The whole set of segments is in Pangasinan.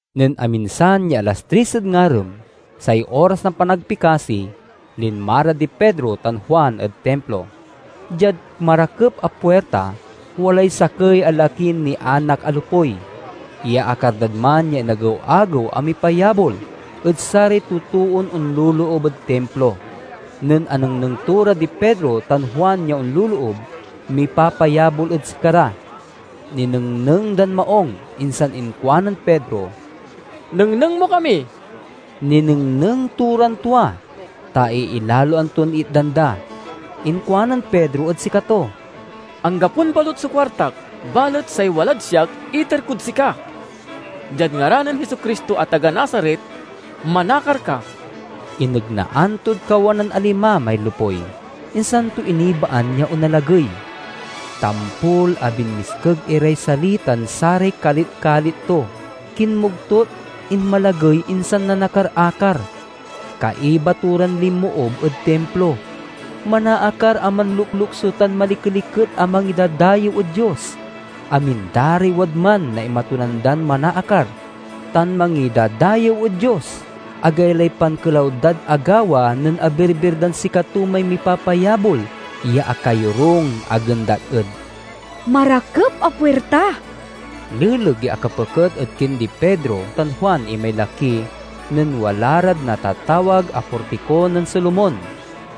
Nen aminsan ya alas tris ed ngarem, say oras na panagpikasi, linma ra di Pedro tan Juan ed Timplo. Diad "Marakep a Puirta," walay sakey a lakin nianak a lopuy. Iyaakar dad man ya inagew-agew a mipayabol ed saray totoon onloloob ed Timplo. Nen anengneng to ra di Pedro tan Juan ya onloloob, mipapayabol ed sikara. Ninengneng dan maung, insan inkuanen Pedro, "Nengneng mo kami!" Ninengneng to ran tua, ta iilaloan ton itdan da. Inkuanen Pedro ed sikato, "Anggapon balut so kuartak, balet say walad siak, iter kod sika: diad ngaran nen Jesu-Cristo a taga Nazaret, manakar ka!" Inegnaan tod kawanan a lima may lopuy, insan to inibaan ya onalagey. Tampol a binmiskeg iray sali tan saray kalit-kalit to, kinmogtut, inmalagey, insan nanakar-akar. Kaiba to ran linmoob ed Timplo; manaakar a manloklokso tan malikeliket a mangidadayew ed Dios. Amin da ray wadman naimatunan dan manaakar tan mangidadayew ed Dios. Agaylay pankelaw dad agawa nen abirbir dan sikato may mipapayabol ya akayorung a gendat ed "Marakep a Puirta." Leleg ya akapeket ed kindi Pedro tan Juan imay laki nen wala rad natatawag a Portiko nen Solomon,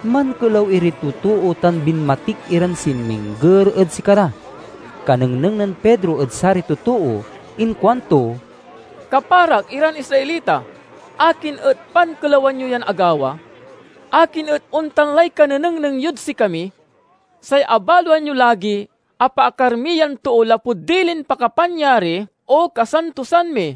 mankelaw iray totoo tan binmatik iran sinmingger ed sikara. Kanengneng nen Pedro ed saray totoo inkuanto, "Kaparak iran Israelita, akin et pankelawan yo yan agawa? Akin et ontan lay kanenengneng yod sikami? Say abaloan yo lagi, apaakar mi yan too lapud dilin pakapanyari o kasantosan mi.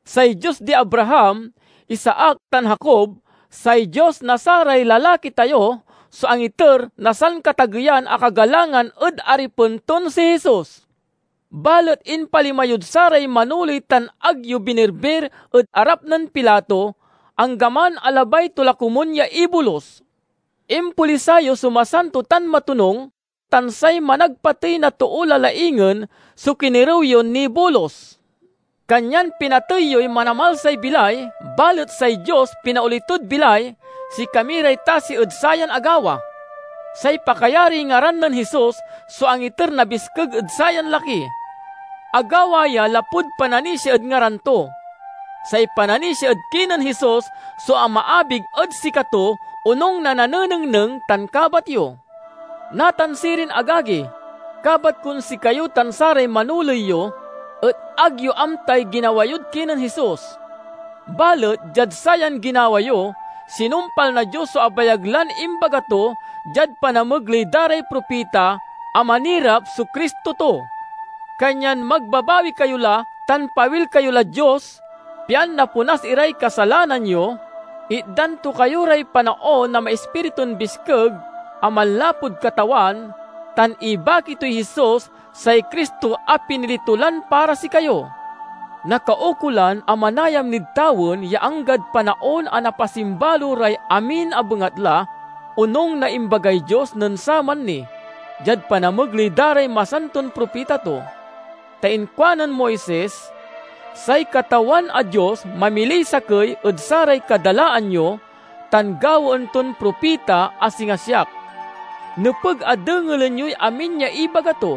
Say Dios di Abraham, Isaac, tan Jacob, say Dios na saray lalaki tayo so angiter na sankatageyan a kagalangan ed Aripen ton si Jesus. Balet impalima yod saray manoley tan ag yo binirbir ed arap nen Pilato, anggaman a labay to la komun ya ibolus. Impolisay yo so Masanto tan Matonung tan say managpatey na too la laingen so kinerew yon nibolus. Kanyan pinatey yoy Manamalsay bilay, balet say Dios pinaoli tod bilay; sikami ray tasi ed sayan agawa. Say pakayariy ngaran nen Jesus so angiter na biskeg ed sayan laki. Agawa ya lapud pananisia ed ngaran to. Say pananisia ed kinen Jesus so amaabig ed sikato, onung na nanenengneng tan kabat yo. "Natan sirin, agagi, kabat kon sikayo tan saray manoley yo et ag yo amtay ginawa yod kinen Jesus. Balet diad sayan ginawa yo, sinumpal na Dios so abayag lan imbaga to, diad panamegley da ray propita, a manirap so Cristo to. Kanyan magbabawi kayo la tan pawil kayo lad Dios, pian naponas iray kasalanan yo, itdan to kayo ray panaon na maispiritun biskeg a manlapud Katawan, tan ibaki toy Jesus—say Cristo a pinili to lan para sikayo. Nakaukolan a manayam nid tawen ya anggad panaon a napasimbalo ray amin a bengatla, onung na imbagay Dios nen saman ni, diad panamegley da ray masanton propita to. Ta inkuanen Moises, 'Say Katawan a Dios mamiliy sakey ed saray kadalaan yo, tan gawaen ton propita a singa siak. Nepeg a dengelen yoy amin ya ibaga to.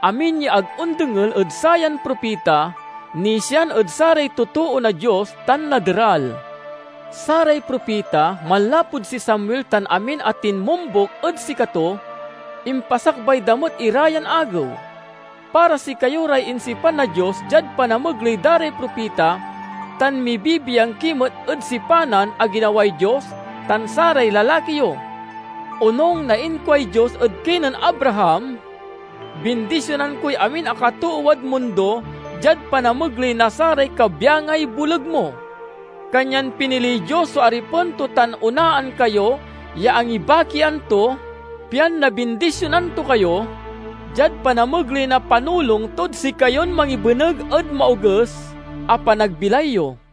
Amin ya ag ondengel ed sayan propita, nisian ed saray totoo na Dios tan naderal.' Saray propita, manlapud si Samuel tan amin a tinmombuk ed sikato, impasakbay da met ira yan agew. Para sikayo ray insipan na Dios diad panamegley da ray propita, tan mibibiang ki met ed sipanan a ginaway Dios tan saray lalaki yo. Onung na inkuay Dios ed kinen Abraham, 'Bindisionan koy amin a katoowad mundo diad panamegley na saray kabyangay boleg mo!' Kanyan piniliy Dios so Aripen to tan onaan kayo ya angibakian to, pian nabindisionan to kayo, diad panamegley na panulong tod sikayon mangibeneg ed maoges a panagbilay yo."